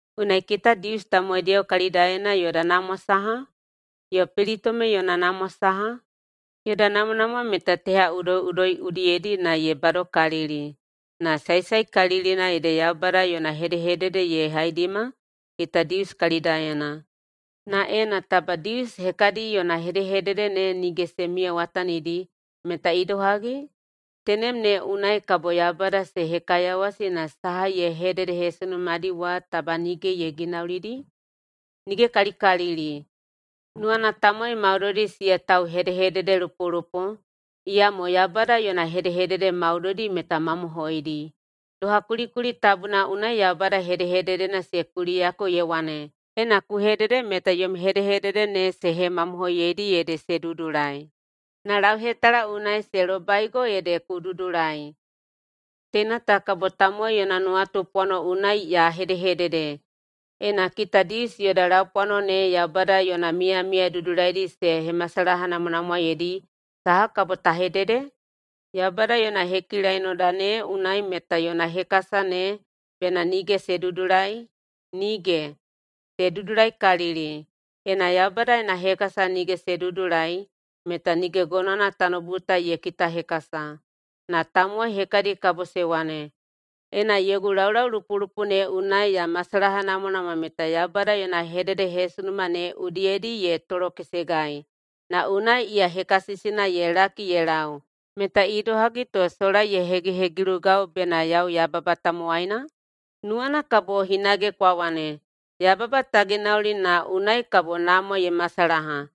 Unai, kita Dius tamowaidiyao kalidaena yoda namwa saha? Yo pelitome yona namwa saha? Yoda namwanamwa meta teha udoiꞌudoi udiyedi na ye badokalili. Na saesaekalilina ede Yaubada yona hedehedede ye haidima kita Dius kalidaena. Na ena taba Dius hekadi yona hedehedede ne nige se miyawatanidi, meta idohagi? Tenem ne unai kabo Yaubada se hekaiyawasi na saha ye hededehesunumadi wa taba nige ye ginaulidi? Nigekalikalili! Nuwana tamowai maudoidi siya tauhedehededelupolupo, iyamo Yaubada yona hedehedede maudoidi meta mamohoidi. Doha kulikuli tabuna unai [Yaubada hedehededena] se kuliyako ye wane, “Ena ku hedede meta yom hedehedede ne se hemamohoiyeidi ede se dudulai, na lauhetala unai se lobaigo ede ku dudulai.” Teina ta kabo tamowai yona nuwatupwano unai ya hedehedede: Ena [kita Dius] yoda laupwano ne Yaubada yona miyamiya dudulaidi se hemasalahanamwanamwaeidi, saha kabo ta hedede? Yaubada yona hekilainoda ne unai meta yona hekasa ne bena nige se dudulai? Nige! Se dudulaikalili! Ena Yaubada yona hekasa nige se dudulai, meta nige gonowana tanoubu ta ye kitahekasa. Na tamowai hekadi kabo se wane, “Ena yogu laulaulupolupo ne unai ya masalahanamwanamwa meta Yaubada yona hededehesunuma ne udiyedi ye tolokesegai, na unai iya hekasisina ye laki ye lau, meta idohagi to sola ye hegihegilugau bena yau yababa tamowaina?” Nuwana kabo hinage kwa wane, “Yababa ta ginauli na unai kabo namwa ye masalaha.”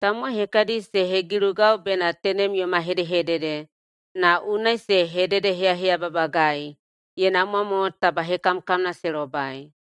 Tamowai hekadi se hegilugai bena tenem yoma hedehedede, na unai se hededeheyaheyababagai. Ye namwa mo taba hekamkamna se lobai!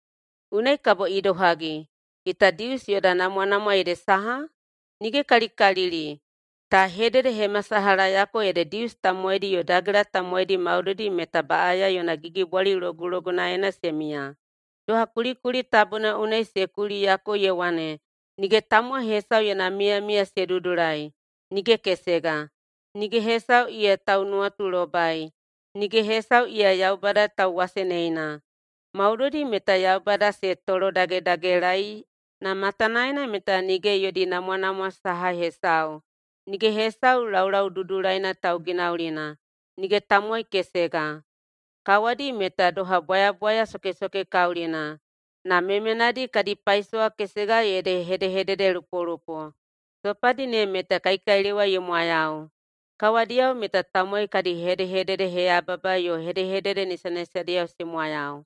Unai kabo idohagi? [Kita Dius] yoda namwanamwa ede saha? Nige kalikalili! Ka hededehemasalahayako ede Dius tamowaidi yo Dagela tamowaidi maudoidi meta baꞌaya yona gigibwali logulogunaena se miya. Doha kulikuli tabuna unai se kuliyako ye wane, “Nige tamowai hesau yona miyamiya se dudulai, nige kesega. Nige hesau iya taunuwatulobai, nige hesau iya Yaubada tauwaseneina. Maudoidi meta Yaubada se tolodagedagelaei na matanaena meta nige yodi namwanamwa saha hesau. Nige hesau laulau dudulaina tauginaulina, nige tamowai kesega.” “Kawadi meta doha bwayabwaya sokesokekaulina, na memenadi kadi paisowa kesega ede hedehededelupolupo.” “Sopadi ne meta kaikailewa ye mwayau.” “Kawadiyao meta tamowai kadi hedehededeheyababa yo hedehedede nisanisadiyao se mwayau.”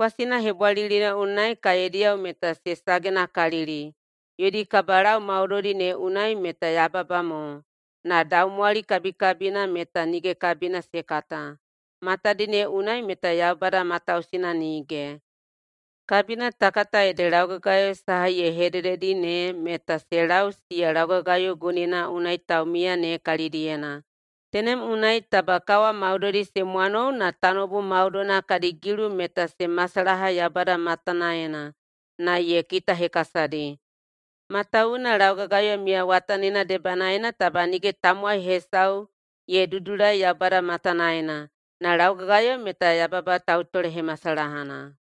“Kwasina hebwalilina unai kaediyao meta se sagenakalili. Yodi kabalau maudoidi ne unai meta yababa mo, na daumwali kabikabina meta nige kabina se kata.” “Matadi ne unai meta Yaubada matausina nige.” Kabina ta kata ede laugagayo saha ye hedededi ne meta se lau siya laugagayo gunina unai taumiya ne kalidiyena. Tenem unai taba kawa maudoidi se mwanou na tanoubu maudoina kadi gilu meta se masalaha Yaubada matanaena na ye kitahekasadi. Matawuwuna laugagayo miyawatanina debanaena taba nige tamowai hesau ye dudulai Yaubada matanaena, na laugagayo meta yababa tautolehemasalahana.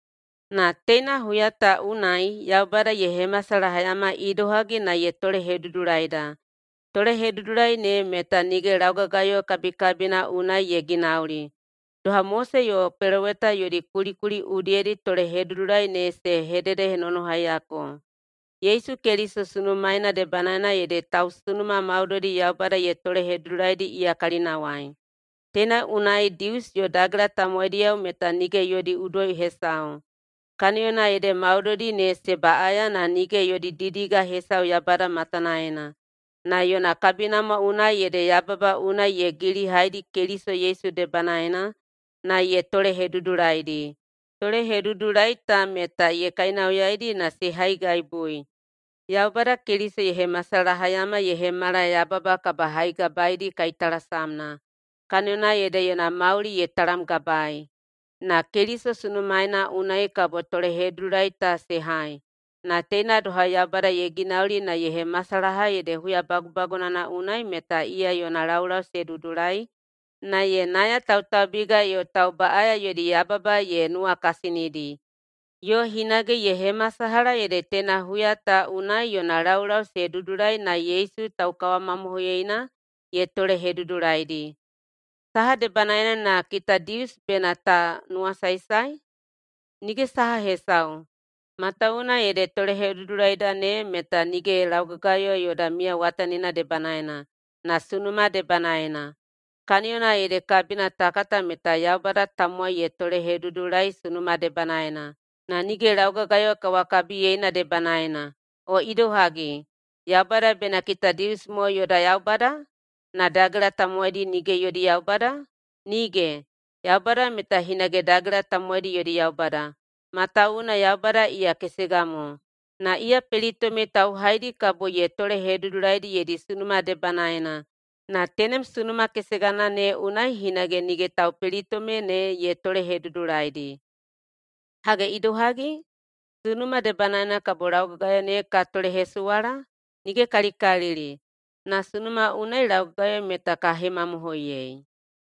Na teina huya ta unai Yaubada ye hemasalahayama idohagi na ye tolehedudulaida. Tolehedudulai ne meta nige laugagayo kabikabina unai ye ginauli, doha Mose yo peloweta yodi kulikuli udiyedi tolehedudulai ne se hededenonohaiyako. Yesu Keliso sunumaeina debanaena ede tausunuma maudoidi Yaubada ye tolehedudulaidi iya kalinawai. Teina unai Dius yo Dagela tamowaidiyao meta nige yodi udoi hesau, kaniyona ede maudoidi ne se baꞌaya na nige yodi didiga hesau Yaubada matanaena. Na yona kabinamwa unai ede yababa unai ye yailihaidi Keliso Yesu debanaena na ye tolehedudulaidi. Tolehedudulai ta meta ye kainauyaidi na se haigaibui. Yaubada Keliso ye hemasalahayama ye hemala yababa kabahaigabaedi kaitalasamna, kaniyona ede yona mauli ye talamgabaei. Na Keliso sunumaeina unai kabo tolehedudulai ta se hai. Na teina doha Yaubada ye ginauli na ye hemasalaha ede huya bagubagunana unai meta iya yona laulau se dudulai na ye nayatautaubiga yo taubaꞌaya yodi yababa ye nuwakasinidi. Yo hinage ye hemasalaha ede teina huya ta unai yona laulau se dudulai na Yesu taukawamamohoiyeina ye tolehedudulaidi. Saha debanaena na [kita Dius] bena ta nuwasaesae? Nige saha hesau, matawuwuna ede tolehedudulaida ne meta nige laugagayo yoda miyawatanina debanaena, na sunuma debanaena. Kaniyona ede kabina ta kata meta Yaubada tamowai ye tolehedudulai sunuma debanaena, na nige laugagayo kawakabiyeina debanaena. O idohagi, Yaubada bena kita Dius mo yoda Yaubada? Na dagela tamowaidi nige yodi Yaubada? Nige! Yaubada meta hinage dagela tamowaidi yodi Yaubada, matawuwuna Yaubada iya kesega mo, na iya pelitome tauhaidi kabo ye tolehedudulaidi yodi sunuma debanaena na tenem sunuma kesegana ne unai hinage nige taupelitome ne ye tolehedudulaidi. Hage idohagi? Sunuma debanaena kabo laugagayo ne ka tolehesuwala? Nige kalikalili! Na sunuma unai laugagayo meta ka hemamohoiyei.